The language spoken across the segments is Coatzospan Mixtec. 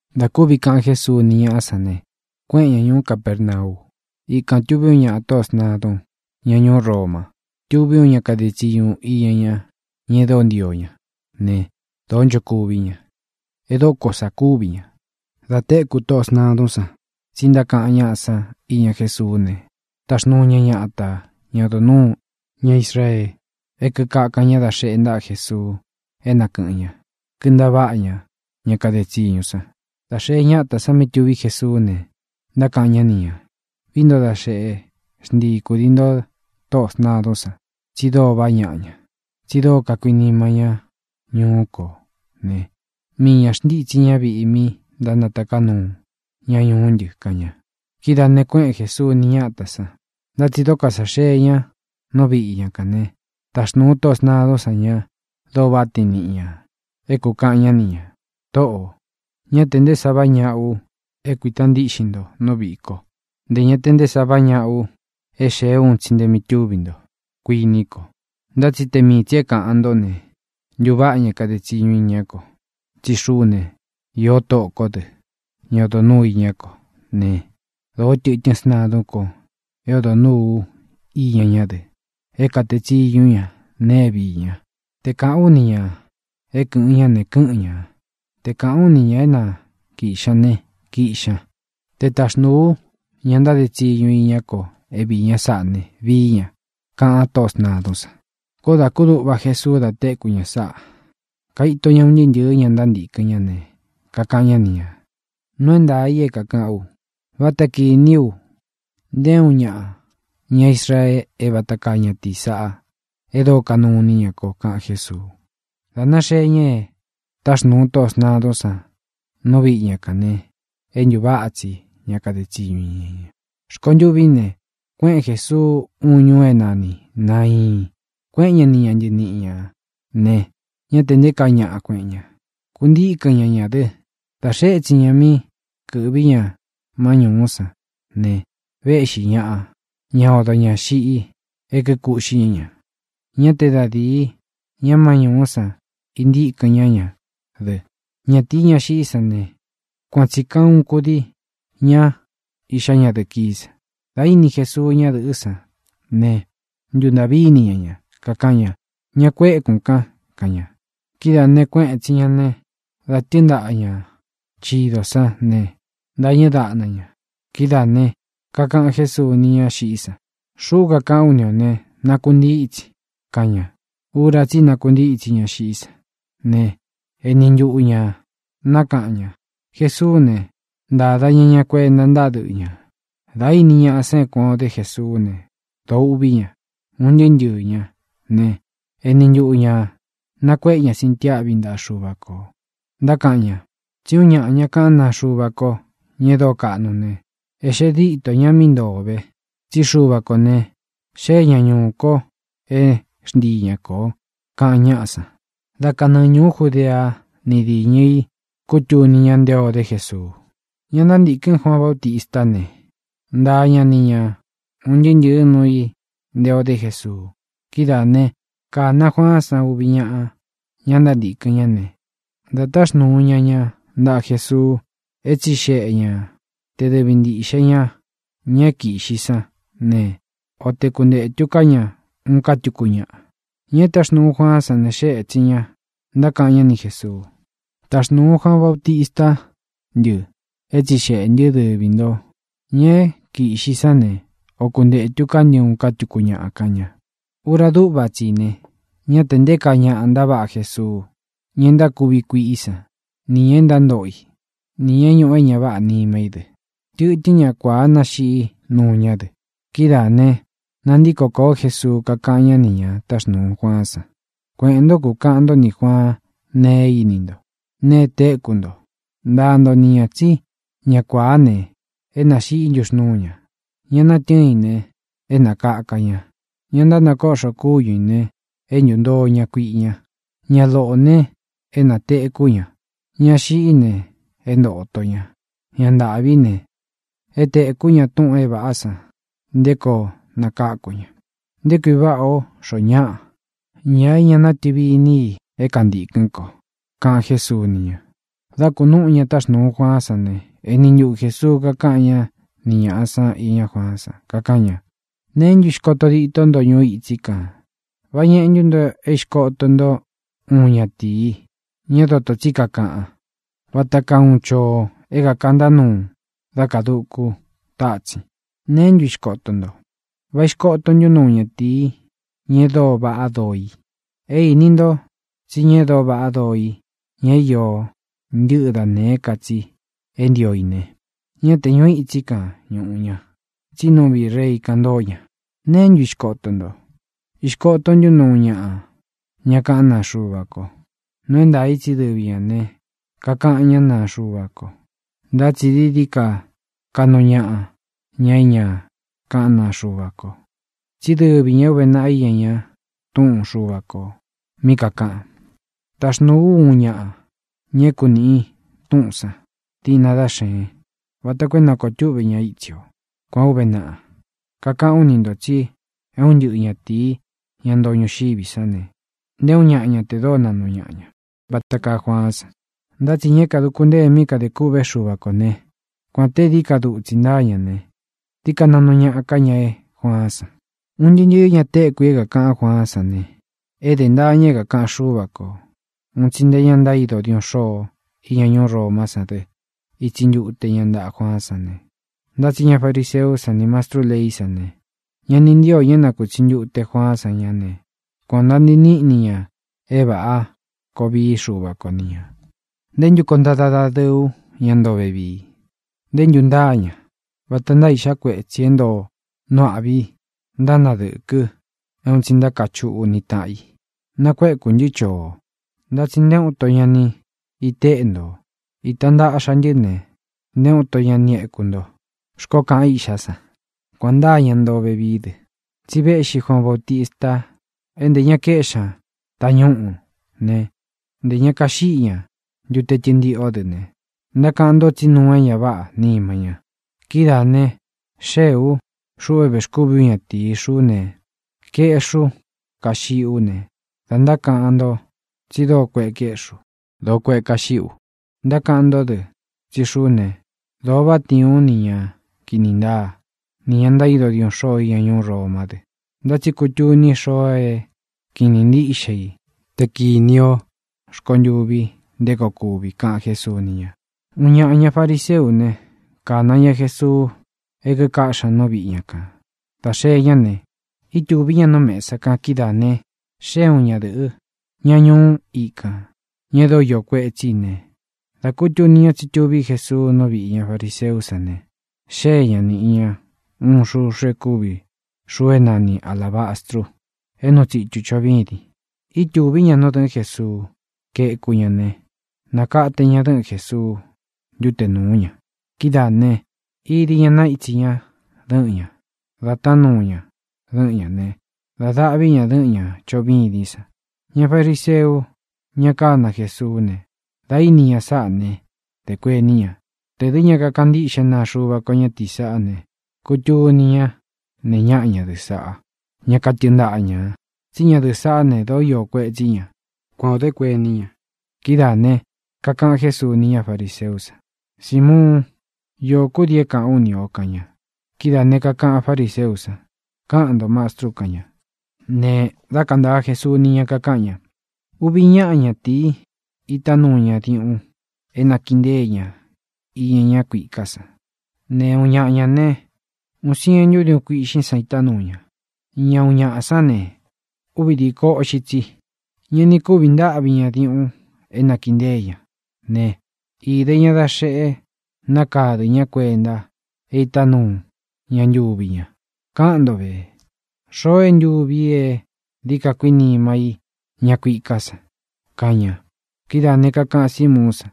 Dā kúvi kaꞌan Jesuu ni ñáꞌa sán ne, kuéꞌen ña ñūú Capernau. Ikān tuví uun ñaꞌā tóꞌō sntadun, ña ñuú Roma. Tuví uun ña kade tsiñu iña ña, ña e dóo ntio ña ne, dōó nchokuví ña. E dóko sā kúvi ñā. Da téku tóꞌō sntadún san tsi ntákaꞌan ñáꞌa san iña Jésuú ne, taxnūu ña ñata, ña odo nūu ña Israee, e kíkakan ñá dā xeꞌe ntaꞌa Jesuu é na kɨ̄ꞌɨn ña, kintaváꞌa ña ña kade tsiñu san. Dā xee ñátā san mí tuví Jesuú ne, ntákaꞌan ñá ni ñā: —Vií nto da xeꞌe, xntii kudii nto tóꞌō sntadún san, tsi dóo vaꞌá ñaꞌa ña, tsi dóo kakuinima ñá ñuú kō ne, mii ñā xntítsi ña viꞌi mí ntánataká nuu ña ñuú ntɨ —kaꞌan ña. Kidáā ne, kuéꞌen Jēsuu ni ñátā san. Ntá tsi dóko sā xee ña nú viꞌi ña kān né, taxnūu tóꞌō sntadún san ña dóo váꞌa tiin niꞌi ñā é kūkaꞌan ñá ni ñā: —Tōꞌó, ñá tē nté sa váꞌa ñaꞌa u é kuīta ntíꞌxin nto nú viꞌī ko. Ntē ña te nté sa váꞌa ñaꞌa u é xēé u un tsi nte mí tuví nto, kuiní ko. Ntá tsi te mii tsī é kāꞌan ntó ne, ntūváꞌa ña kade tsiñu iñá ko. Tsí xuꞌú ne, īó tóꞌō kó dɨ, ña odo nūu iñá ko ne, dōó tɨtɨ́n sntadún ko é odo nūu ú iña ñá dɨ, é kātee tsiñú u ña nēe é vií ña. Te kāꞌán u ni ñā é kɨ̄ꞌɨn ñá ne, kɨ́ꞌɨn ñā. Te kāꞌán u ni ñā é na kīꞌxi ña ne, kiꞌxi ña. Te taxnūu ú ña ntáde tsiñu iñá ko é viī ña sáꞌā ne, vií ña —kaꞌan tóꞌō sntadún san. Koó dā kúduꞌva Jesuu da téku ña sáꞌā. Kaito ña un ntɨɨ́ ntɨ̄ɨ́ ña ntántīkɨn ñá ne, kakaꞌan ñá ni ñā: —Nuu é ntaā i é kākaꞌán u: Váta kīní u nté uun ñaꞌa ña Israee é vata kaa ñatīi sáꞌa e dóo kanuu iní ña ko —kaꞌan Jésuu. Dā náxee ña e táxnūu tóꞌō sntadún san nú viꞌi ña kān ne, é ntūváꞌa tsi ña kade tsiñu iña ña. Rkontûví ne, kuéꞌen Jēsuu uun ñuu é nani Nāiin. Kuéꞌen ña ni ña ntɨniꞌi ñā ne, ñá tē nté kaa ñaꞌa kueꞌen ña, kuntikɨ̄n ñá ña dɨ. Dā xee étsin ña mí kɨ̄ꞌví ña má ñūú san ne, véꞌxi ñāꞌa, ña odo ñā xiꞌi e kíkuꞌxí ña ña. Ñá te da dīi ña má ñūú san íntīkɨn ñá ña dɨ. Ñatīi, ña xiꞌí san ne, kuan tsī kaa uun kudii ña iꞌxá ñadɨ̄ꞌɨ kií san. Dā íni Jesuu ñádɨ̄ꞌɨ́ san ne, ntūntaꞌví ini ña ña, kakaꞌan ña: —Ña kuékūn kan —kaꞌan ña. Kidáā ne, kuéꞌen ētsin ña ne, dā tɨ́ɨn ntaꞌa ña chidō sán ne, íntāñɨ dáꞌna ña. Kidáā ne, kakaꞌan Jésuu ni ñá xiꞌí san: —Xuꞌú kakaꞌán u ni ō ne: ¡Nakuntítsin! —kaꞌan ña. Ura tsí i nakuntítsi ña xiꞌí san ne, eni ntuꞌu ñā nákaꞌan ña. Jesuú ne, ntáda ña ña kuenta ntáꞌa dɨꞌɨ ñā. Dā íni ñaꞌa sán é kuān o dé Jesuú ne, dōo uꞌví ña, un ntɨɨ́ ntɨɨ̄ ñá ne, eni ntuꞌu ñā nakuéꞌe ña sintiáꞌvi ntaꞌa Xuva kō, ntákaꞌan ña: —Tsí uun ñaꞌa ña kaꞌán naa Xuva ko, ña e dóo kaꞌnu ne, é xee dîtó ñā mí ntoo ō ve. Tsí Xuva kō ne, xée ña ñūú kō é xntii ña kō —kaꞌan ñáꞌa san. Dá kanɨɨ ñūú Judea ni diñɨ í kūtuni ña nté ō dé Jesuu. Ña ntántīkɨn Juaan Bautistá ne, ntaa ña ni ña un ntɨɨ́ ntɨ̄ɨ́ nuu i nté ō dé Jesuu. Kidáā né, kāna Juaán san uvi ñáꞌa, ña ntántīkɨn ñá ne, dā táxnūu ña ña ntaꞌa Jesuu é tsixeꞌe ña te dɨvi ntīꞌxe ña ña é kīꞌxi sán ne, o te kuntētu ká ña uun ká tuku ñáꞌa. Ña e táxnūu Juaán san ne, xée ētsin ña, ntákaꞌan ñá ni Jēsuu: —Taxnūu Juaan Bautistá ntɨ é tsixeꞌē ntɨ́ te dɨvi nto ñā é kīꞌxi sán ne, o kuntētu ká ntɨ uun ká tuku ñáꞌa —kaꞌan ña. Ura dúꞌva tsi i ne, ñá tē nté kaa ñaꞌa ntaváꞌa Jesuu, ña e ntákuvi kuiꞌí san, nī ña e ntántoꞌo i, nī ña é ñūꞌu é ña váꞌā nima í dɨ. Tɨtɨ́n ña kuāá nāxiꞌí nuu ñá dɨ. Kidáā ne, nantíko kōó Jesuu, kakáꞌan ñá nī ña táxnuu Juaán san: —Kueꞌēn ntó, kukaꞌan ntó nī Juaan nee é íni nto, nee é téku nto. Ntaa nto ni ñā tsí ña kuāá ne, é nāxiꞌí ntuxnūú ña; ña natɨ́ɨn i ne, é nākaka ña; ña ntánakoꞌxo kúñu ī ne, é ntūntoo ña kuiꞌi ña; ña loꞌō ne, é nātekú ña; ña xiꞌí ne, é ntōto ña; ñá ntāꞌví ne, é tēkú ña túꞌūn é vāꞌá san nté koo nakáku ña. ¡Nté kui váꞌā ó xoo ñáꞌa, ña é ña natɨvi iní i é kantīkɨ́n ko! —kaꞌan Jésuu ni ña. Dā kunúꞌu ña táxnuu Juaán san ne, eni ntuꞌu Jēsuu kakáꞌan ñá ni ñāꞌa san iñá Juaán san, kakaꞌan ña: —¿Neé ntu ixkoto ditó nto ñuu itsí kān? ¿Vá ñeꞌe ntú nto é ixkoto nto uun ñatīi, ña é dotō tsí kakaꞌan, vata kaa uun choo é kākantá nuu dá kadūku tátsin? ¿Neé ntu ixkoto nto? ¿Vá ixkoto ntú nto uun ñatīi, ña e dóo vaꞌá doo i? É īni nto tsí ña e dóo vaꞌá doo i, ña é iō ntɨ́ꞌɨ da nēé ka tsi é ntio i ne, ñá tē ñuu itsí kān ñuꞌu ña, tsi nú viꞌī rei kan ntóo ña. ¿Neé ntu ixkoto nto? ¿Īxkoto ntú nto uun ñaꞌa ña kaꞌán naa Xuva ko? Nuu é ntaā i tsí dɨvi ñā ne, kakaꞌan ñá naa Xuva ko, ntá tsi dií dií ka kaꞌnu ñaꞌa ña é ña kaꞌán naa Xuva ko. Tsí dɨvi ñā é ūve naꞌa iña ña Túꞌun Xuva kō mí kakāꞌan: Taxnūu ú uun ñaꞌa, ña é kunīꞌi túꞌūn san, diꞌna dá xeen, vata koo é nākoo túꞌve ña itsi o. Kuān ó uve naꞌa. Kakaꞌán u ni ntō tsi é un ntɨꞌɨ ñatīi, ña ntoo ñuxiví san ne, nté uun ña ña te dóo naꞌnu ñaꞌa ña vata kaa Juaán san. Ntá tsi ña é kāduku ntée mí kadē kûꞌvé Xuva kō ne, kuān te é dií ka dutsi ntaa ña ne, dií ka naꞌnu ñaꞌa ká ña é Juaán san. ʼUn ntɨɨ́ ntɨ̄ɨ́ ña tekú i é kākaꞌan Juaán san ne, ede ntaa ña é kākaꞌan Xúva kō. Un tsi nte ña ntaído diuꞌun xôo iña ñuú Romá san dɨ ítsi ntute ña ntaꞌa Juaán san ne, ntá tsi ña fariseú san nī mastrú leí san ne, ña ni ntío ñā é nakūtsi ntute Juaán san ña ne, kuān o nantii níꞌni ña é vāꞌa koo vií Xuva ko ni ñā. ʼ¿Nté ntu koo ntada dadɨɨ ú ña ntoo vevii? ¿Ntē ntu ntáa ña? Vata ntáa iꞌxá kuetsī é ntoo nu âꞌví i, ntánadɨ̄kɨ, é un tsi ntákachuꞌú ni tāꞌan i: “Nakuekū ntɨ́ choo, ntá tsi nté uun nto ñá ni iteꞌe ntō. Īta ntaꞌxa ntɨ́ ne, nté uun nto ña ni éku nto”, xkoó kaꞌan iꞌxá san. Kuān ntáa ña ntoo vevií dɨ, tsi véꞌxī Juaan Bautista é ntē ña kaéꞌxi ña tañúꞌu ne, ntē ña kaxiꞌí ña ntute tɨntiꞌó dɨ ne, ntákaꞌan nto tsí nuu é ña váꞌā nima ña. Kidáā ne, xeé u, xuꞌu é vēxkúvi ú ñatīi. Xuꞌú ne, kaeꞌxí u, kaxiꞌí u ne, da ntákaꞌan nto tsi dóo kueꞌe kaeꞌxí u, dōo kueꞌe kaxiꞌí u. Ntákaꞌan nto dɨ tsí xuꞌú ne, dōo váꞌa tiin ú nī ña kini ntáa, nī ña ntaído diuꞌun xôo iña ñuú Romá dɨ. Ntá tsi kutuni xoo é kiꞌin īní ntiꞌxe i te kīni o rkontûvi nté koo kuvi —kaꞌan Jésuu ni ña. Uun ñaꞌa, ña fariseú ne, kāna ña Jesuu é kikaꞌxí ña nú viꞌi ña kān. Dā xee ñá ne, ítūví ña nú mesa kan. Kidáā ne, xée uun ñadɨ̄ꞌɨ́, ña ñuú ikān, ña e dóo iō kuetsí ne, da kutuni ña tsí tuví Jesuu nú viꞌī ña fariseú san ne, xée ñā, niꞌi ña uun xuxu e kúvi xuu é nani alābastru é nūu tsitu choꞌo vîdin. Ítūví ña nú dɨ̄ꞌɨ́n Jesuu, kaéku ña ne, nākate ña dɨ́ꞌɨn Jēsuu ntuté nūú ña. Kidáā né, īdi ña naítsī ña dɨꞌɨn ña, da tánuu ña dɨ́ꞌɨn ña ne, dā daꞌví ña dɨ́ꞌɨn ñā choꞌo vîdín san. Ña fariseu, ña kána Jesuú ne, dā íni ña sáꞌā né, dē kuení ña: “Tē dɨ́ ña kakaꞌan ntíꞌxe naa Xuva ko ñatīí saꞌá ne, kutuni ñá nee ñáꞌa ñadɨ̄ꞌɨ́ saꞌá, ña katɨɨn ntaꞌa ñā. Tsí ñadɨ̄ꞌɨ́ saꞌá ne, dōó iō kuetsí ña.” Kuan ō dé kuení ña. Kidáā ne, kakaꞌan Jésuu ni ña fariseú san: —Simuún, iō kúdii é kāꞌán u ni ō —kaꞌan ña. Kidáā ne, kakaꞌan fáriseú san: —Káꞌan ntō, Mastrú —kaꞌan ña. Ne dá kantāa Jesuu ni ña, kakaꞌan ña: —Uvi ñáꞌa ñatīi itá nuu ñā diuꞌun é nakiꞌi ntée ña iña ñá kuiká san ne, uun ñaꞌa ñā ne, úꞌūn sientu diúꞌun kuīꞌxín san itá nuu ña. Ña uun ñaꞌa sán ne, úvi dīko uꞌxi tsi. Ña ni kúvi ntáꞌvi ña diuꞌun é nakiꞌi ntée ña ne, īde ña da xeꞌe nákadɨ̄ ñá kuenta é itá nuu ña ntuvi ña. Káꞌan nto vē: ¿Xoo é ntuvi i é dií ka kuinima í ña kuiká san? —kaꞌan ña. Kidáā ne, kakaꞌan Símuún san: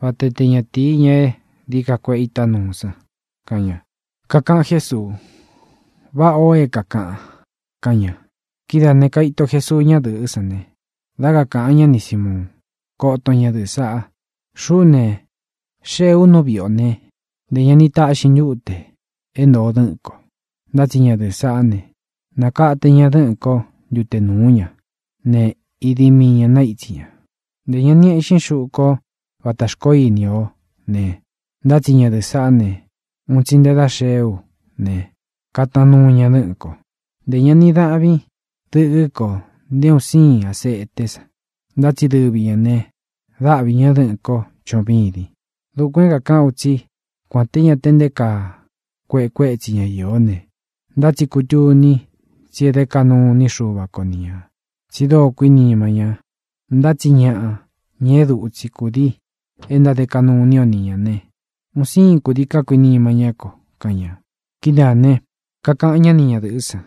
—Vata te ñatīi, ña é dií ka kuēꞌe itá nuu san —kaꞌan ña. Kakaꞌan Jésuu: —Váꞌā o é kākaꞌan —kaꞌan ña. Kidáā ne, kaito Jesuu ñádɨ̄ꞌɨ́ san ne, dá kakāꞌan ñá ni Sīmuun: —Koton ñadɨ̄ꞌɨ saꞌa. Xuꞌú ne, xéē u nú viꞌi ō né, ntē ña ni taꞌxin ntute é ntōo dɨ́ꞌɨ̄n ko. Ntá tsi ñadɨ̄ꞌɨ́ saꞌá ne, nakate ña dɨ́ꞌɨ̄n kó ntute núu ña ne, idi mii ñā naítsi ña. Ntē ña ni éꞌxin xuꞌu kó vata xkoó ini o ne, ntá tsi ñadɨ̄ꞌɨ́ sāꞌá ne, un tsi nte dá xee ú ne, katanuu ña dɨ́ꞌɨ̄n ko. Ntē ña ni dáꞌvin dɨkɨ́ ko nté un siin aseté san. Ntá tsi dɨvi ñā ne, dáꞌvi ña dɨ̄ꞌɨ́n ko choꞌo vîdin. Dukuān é kākaꞌán u tsí kuān te ñá tē nté kaa kueꞌe kuétsi ña īó ne, ntá tsi kutuni tsí e dé kaꞌnu iní Xuva ko ni ñā, tsi dóo kuínima ña. Ntá tsi ñaꞌa, ña é dutsi kūdii e ntáde kaꞌnu iní o ni ñā ne, un sīin kudií kakuinima ñá kō —kaꞌan ña. Kidáā ne, kakaꞌan ñá ni ñadɨ̄ꞌɨ́ san: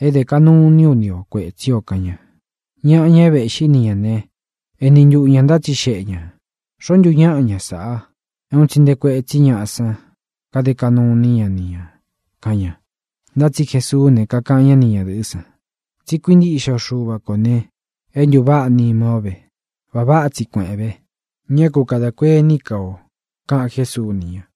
—É dē kaꞌnu iní u ni ō kuétsi ō —kaꞌan ña. Ñaꞌa, ña é vexkáꞌxi ni ña ne, eni ntuꞌu ñā ntátsixeꞌe ñā: —¿Xoō ntu ñáꞌa ña sāꞌa, é un tsi nte kuétsi ñāꞌa san kade kaꞌnu iní ña ni ñā? —kaꞌan ña. Ntá tsi Jesuú ne, kakaꞌan ñá ni ñadɨ̄ꞌɨ́ san: —Tsi kuíntiꞌxe o Xuva kō ne, é ntūváꞌa nima ó ve. Va váꞌa tsi kuēꞌén ve, ñá ku kadā kuení ka o —kaꞌan Jésuu ni ña.